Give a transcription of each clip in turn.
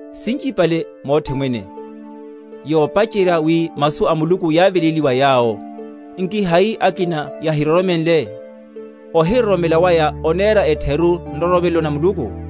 Sinchipale mothe mwene: yopacherya, wi masu a Muluku yáveléliwa wa yawo. Nki hai akina yahiroromenle? Ohiroromela waya onera etheru nroromelo na Muluku?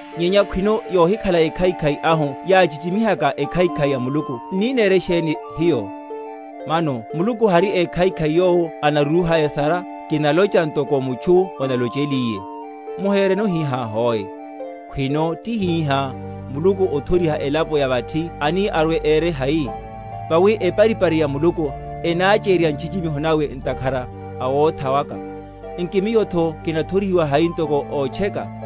Nyenya khwino yohikhala ekhaikhai ahu yáchichimihaka ekhaikhai ya Muluku, n’ni nere sheni hiyo? Mano Muluku hari ékhaikhai yowo anarúha esara? (kinalocha ntoko mutchu onalocheliye). Muhereno hihá hoe. Khwino tihihá, Muluku othoriha elapo ya vathi ani arwe ere hai? Vawi eparipari ya Muluku enachérerya nchichimiho nawe ntakhara a wotha waka, nki miyotho kinathorihiwa hai ntoko ótcheka?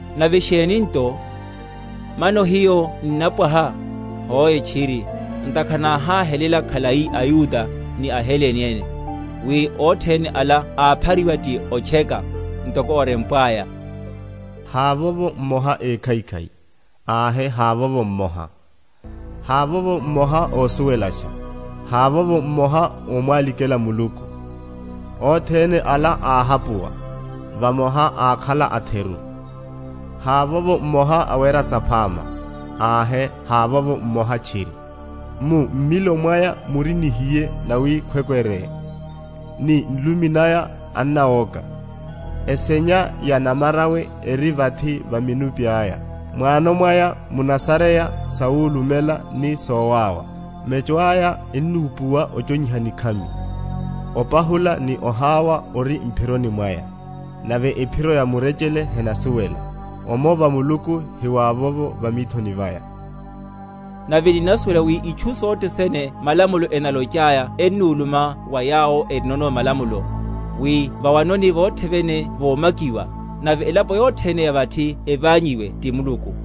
Nave sheni nto? Mano hiyo ninnapwaha? Hoe tchiri; ntakhara náháhelela khalai aYuda ni aHelene ene, wi othene ala áphariwa ti otcheka; ntoko orempwaya, Havovo mmoha ékhaikhai, ahe havovo mmoha; Havovo mmoha ósuwelasha, Havovo mmoha ómwalikhela Muluku; Othene ala áhapuwa, vamoha ákhala atheru; Havovo mmoha awera saphama, ahe, havovo mmoha tchiri. Mu mmilo mwaya muri nihiye nawi kwekwere; Ni nlumi naya ennawoka; Eshenya ya namarawe eri vathi va minuphi aya; Mwano mwaya munasareya sawulumela ni sowáwa; Mecho aya ennúpuwa ochonyiha nikhami; Opahula ni oháwa ori m’phironi mwaya; Nave ephiro ya murechele henasuwela; Omova Muluku hiwavovo va mithoni vaya. Nave ninnasuwela wi itchu sothe sene malamulo enalochaya ennuluma wa yawo erinono malamulo; wi va’wanoni vothe vene vomakiwa, nave elapo yothene ya vathi eványiwe ti Muluku;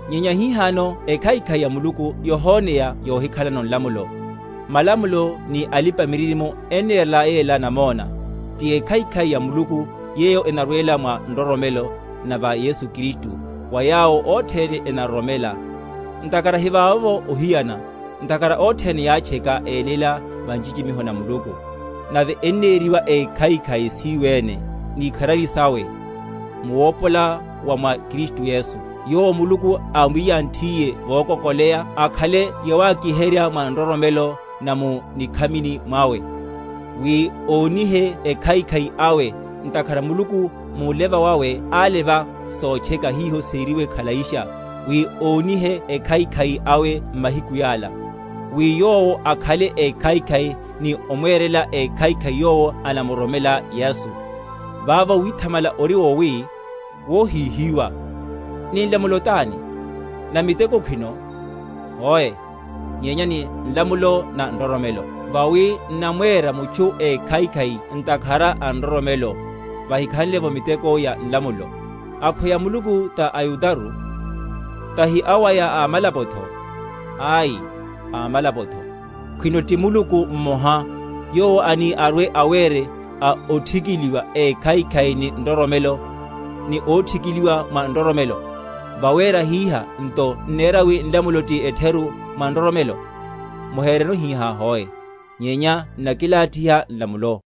Nyenya hihano ekhaikhai ya Muluku yohoneya yohikhalano nlamulo, malamulo ni alipa‐miririmo ennerela yela namona; ti ekhaikhai ya Muluku yeyo enarwela mwa nroromelo na va Yesu Kristu wa yawo othene enaroromela; ntakhara hivavovo ohiyana; ntakhara othene yátcheka, eyeléla va nchichimiho na Muluku; nave eneriwa ékhaikhai siyo ene, ni ikharari sawe, mu wopola wa mwa Kristu Yesu; Yowo Muluku ámwiyanthiye vokokoleya akhale yawakiherya mwa nroromelo na mu nikhamini mwawe, wi ónihe ekhaikhai awe, ntakhara Muluku múleva wawe áleva sotcheka hiho seriwe khalaisha; wi ónihe ekhaikhai awe m’mahiku yala; wi Yowo akhale ékhaikhai, ni omwera ékhaikhai yowo anamuroromela Yesu. Vavo withamala ori wowi? Wóhíhiwa. Ni nlamulo tani? Na miteko khwino? Hoe; nyenya ni nlamulo na nroromelo. Vawi n’namwera mutchu ékhaikhai ntakhara a nroromelo, vahikhanle’vo miteko ya nlamulo. Akhweya Muluku ta Yudaru? Tahi awaya a amalapotho? Ai; a amalapotho. Khwino ti Muluku mmoha, yowo ani arwe‐awere a othikiliwa ékhaikhai ni nroromelo, ni óthikiliwa mwa nroromelo. Vawera hiha nto n’nera wi nlamulo ti etheru mwa nroromelo? Muhereno hihá hoe; nyenya n’nakilathiha nlamulo.